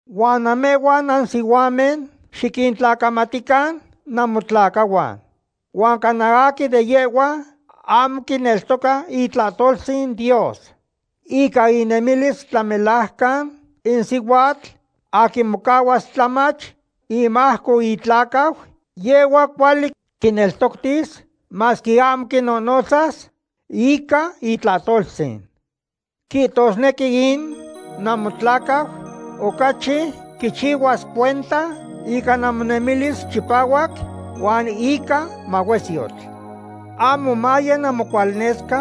Huan namehhuan nansihuamen xiquintlacamatican namotlacahuan. Huan cana aquin de yehhuan ahmo quineltoca itlahtoltzin Dios. Ica inemilis tlamelajcan in sihuatl aquin mocahuas tlamach imajco itlacau, yehhua cuali quineltoctis masque ahmo quinonotzas ica itlahtoltzin. Quihtosnequi in namotlacau ocachi quichihuasque cuenta ica namonemilis chipahuac huan ica mahuesyotl. Ahmo maye namocualnesca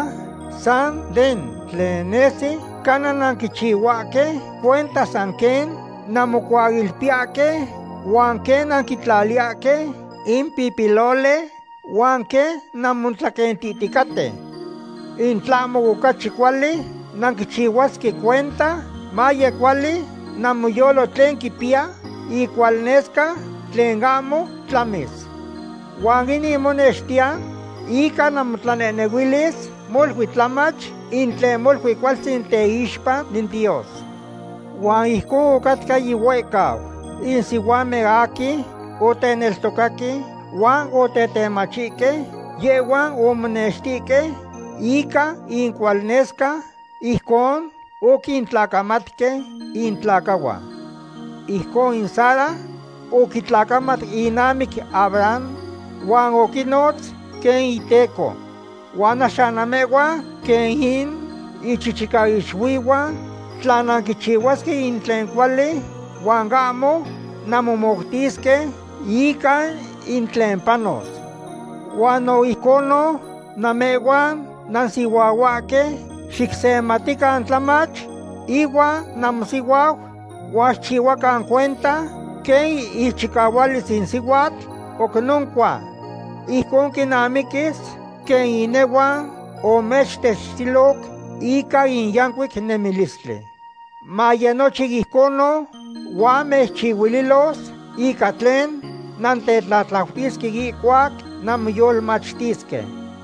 san den tlen nesi, cana nanquichihuahque cuenta san quen nanmocuailpiyahque, huan quen nanquintlaliyahque in pipiloli, huan quen nanmotlaquentihticaten. In tlahmo ocachi cuali nanquichihuasque cuenta maye cuali namoyolo tlen quipiya icualnesca tlen ahmo tlamis. Huan inin monextiya ica namotlanehnehuilis molui tlamach, in tlen molui cualtzin teixpa in Dios. Huan ijconon ocahcatca yihuehcau. In sihuamen aquin oteneltocaque huan otetemachihque, yehhuan omonextihque ica incualnesca ijcon oquintlacamatque intlacahuan. Ijcon in Sara oquitlacamat inamic Abraham huan oquinotz quen iteco. Huan axan namehhuan quen in ichichicaixuihuan tla nanquichihuasque in tlen cuali huan ahmo nanmomoutisque ica in tlen panos. Huan no ijconon, namehhuan nansihuahuahque, xicsematican tlamach ihuan namosihuau, huan xicchihuacan cuenta quen ichicahualis in sihuatl oc noncua. Ijcon quinamiquis quen inehuan omechtechtiloc ica in yancuic nemilistli. Maye nochin ijconon huan mechchihuililos ica tlen nantetlatlautisque ihcuac nanmoyolmachtisque.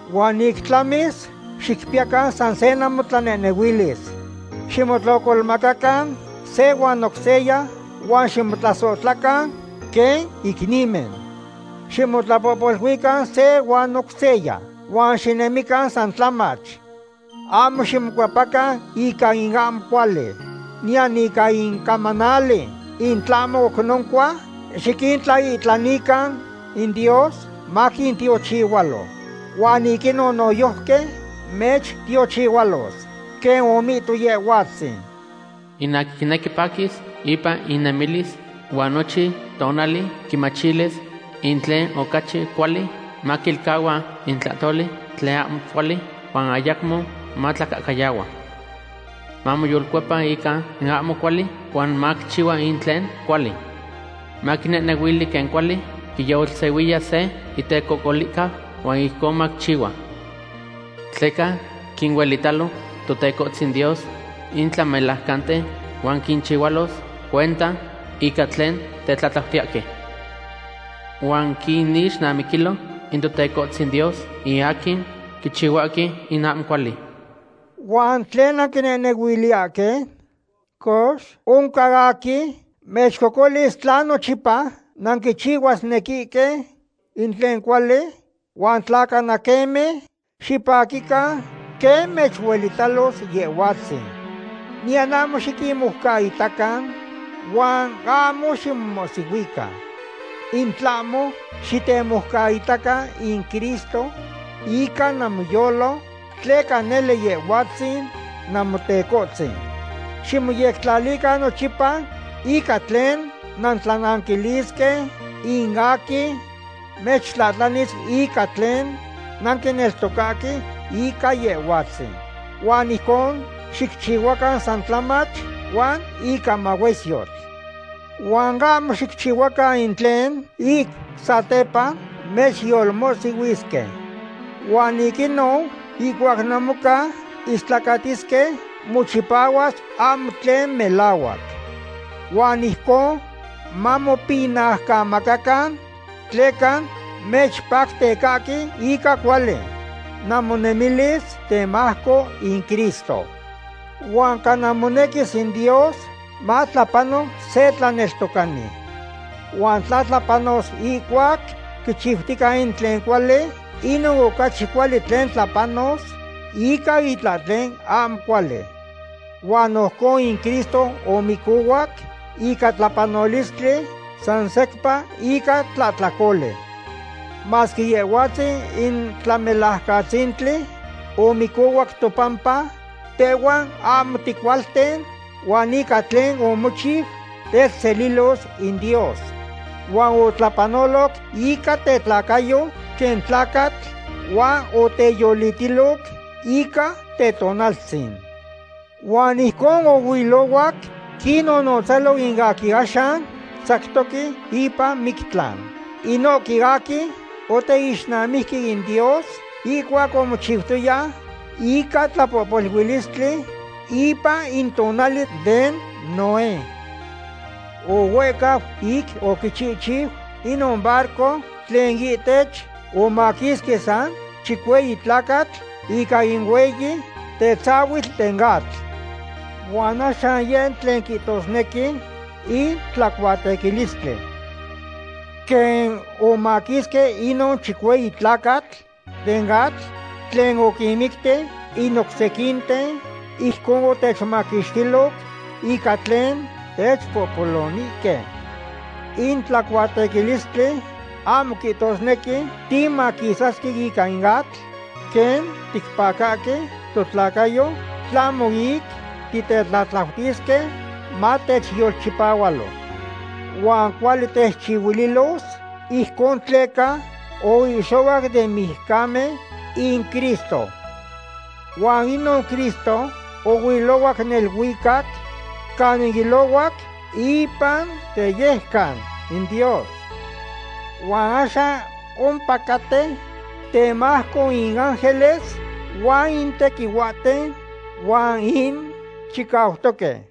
Huan ic tlamis, xicpiyacan san se namotlanehnehuilis. Ximotlocolmacacan se huan oc seya huan ximotlasohtlacan quen icnimen. Ximotlapohpoluican se huan oc seya huan xinemican san tlamach. Ahmo ximocuepacan ica in ahmo cuali, niyan ica in camanali, in tlahmo oc noncua xiquintlaihtlanican in Dios maquintiochihualo. Huan ic inon noyojqui mechtiochihualos. Quen omihto Yehhuatzin: In aquin quinequi paquis ipan inemilis huan nochin tonali quimachilis in tlen ocachi cuali, maquilcahua in tlahtoli tlen ahmo cuali, huan ayacmo matlacahcayahua. Mamoyolcuepa ica in ahmo cuali huan maquichihua in tlen cuali. Maquinehnehuili quen cuali quiyolsehuiya se itecocolihcau huan ijcon maquichihua. Tleca quinuelitalo Totecohtzin Dios in tlamelajcanten huan quinchihualos cuenta ica tlen tetlatlautiyahque. Huan quinixnamiquilo in Totecohtzin Dios in aquin quichihuahque in ahmo cuali. ¿Huan tlen nanquinehnehuiliyahque? Cox, ¿oncan aquin mechcocolis tla nochipa nanquichihuasnequihque in tlen cuali? Huan tla cana queme, xipaquican quen mechuelitalos Yehhuatzin. Niyan ahmo xiquinmoucaitacan huan ahmo ximomohsihuican. In tlahmo xitemoucaitacan in Cristo ica namoyolo tleca nele Yehhuatzin Namotecohtzin. Ximoyectlalican nochipa ica tlen nantlananquilisque in aquin mechtlahtlanis ica tlen nanquineltocahque ica Yehhuatzin. Huan ijcon xicchihuacan san tlamach huan ica mahuesyotl. Huan ahmo xicchihuacan in tlen ic satepa mechyolmohsihuisque. Huan ic inon ihcuac namoca istlacatisque, mochipahuas ahmo tlen melahuac. Huan ijcon mamopinaucamacacan tleca mechpactecahque ica cuali namonemilis temajco in Cristo. Huan cana monequis in Dios matlapano se tlaneltocani. Huan tla tlapanos ihcuac quichiutica in tlen cuali, inon ocachi cuali quen tlapanos ica itlahtlen ahmo cuali. Huan no ijcon in Cristo omicohuac ica tlapanolistli san secpa ica tlahtlacoli. Masque Yehhuatzin in Tlamelajcatzintli, omicohuac topampa tehhuan ahmo ticualten, huan ica tlen omochiu, techselilos in Dios. Huan otlapanoloc ica tetlacayo quen tlacatl huan oteyolitiloc ica tetonaltzin. Huan ijcon ohuilohuac quinnonotzalo in aquin axan tzactoque ipan mictlan. Inohque aquin oteixnamijque in Dios ihcuac omochixtoya ica tlapohpoluilistli ipan in tonali den Noé. Ohuehcau ic oquichihchiu inon barco tlen ihtech omaquisque san chicueyi tlacatl ica in hueyi tetzahuitl den atl. Huan axan yeh in tlen quihtosnequi in tlacuatequilistli. Quen omaquisque inon chicueyi tlacatl den atl tlen oquinmicti in oc sequinten, ijcon otechmaquixtiloc ica tlen techpohpolonihque. In tlacuatequilistli ahmo quihtosnequi timaquisasque ica in atl quen ticpacahque totlacayo, tlahmo ic titetlatlautisque matechyolchipahualo. Huan cuali techchihuililos ijcon tleca oihxohuac den mijcamen in Cristo. Huan inon Cristo ohuilohuac neluicac canin ilohuac ipan teyejcan in Dios. Huan axan ompacaten temajco in ángeles huan in tequihuahten huan in chicautoque.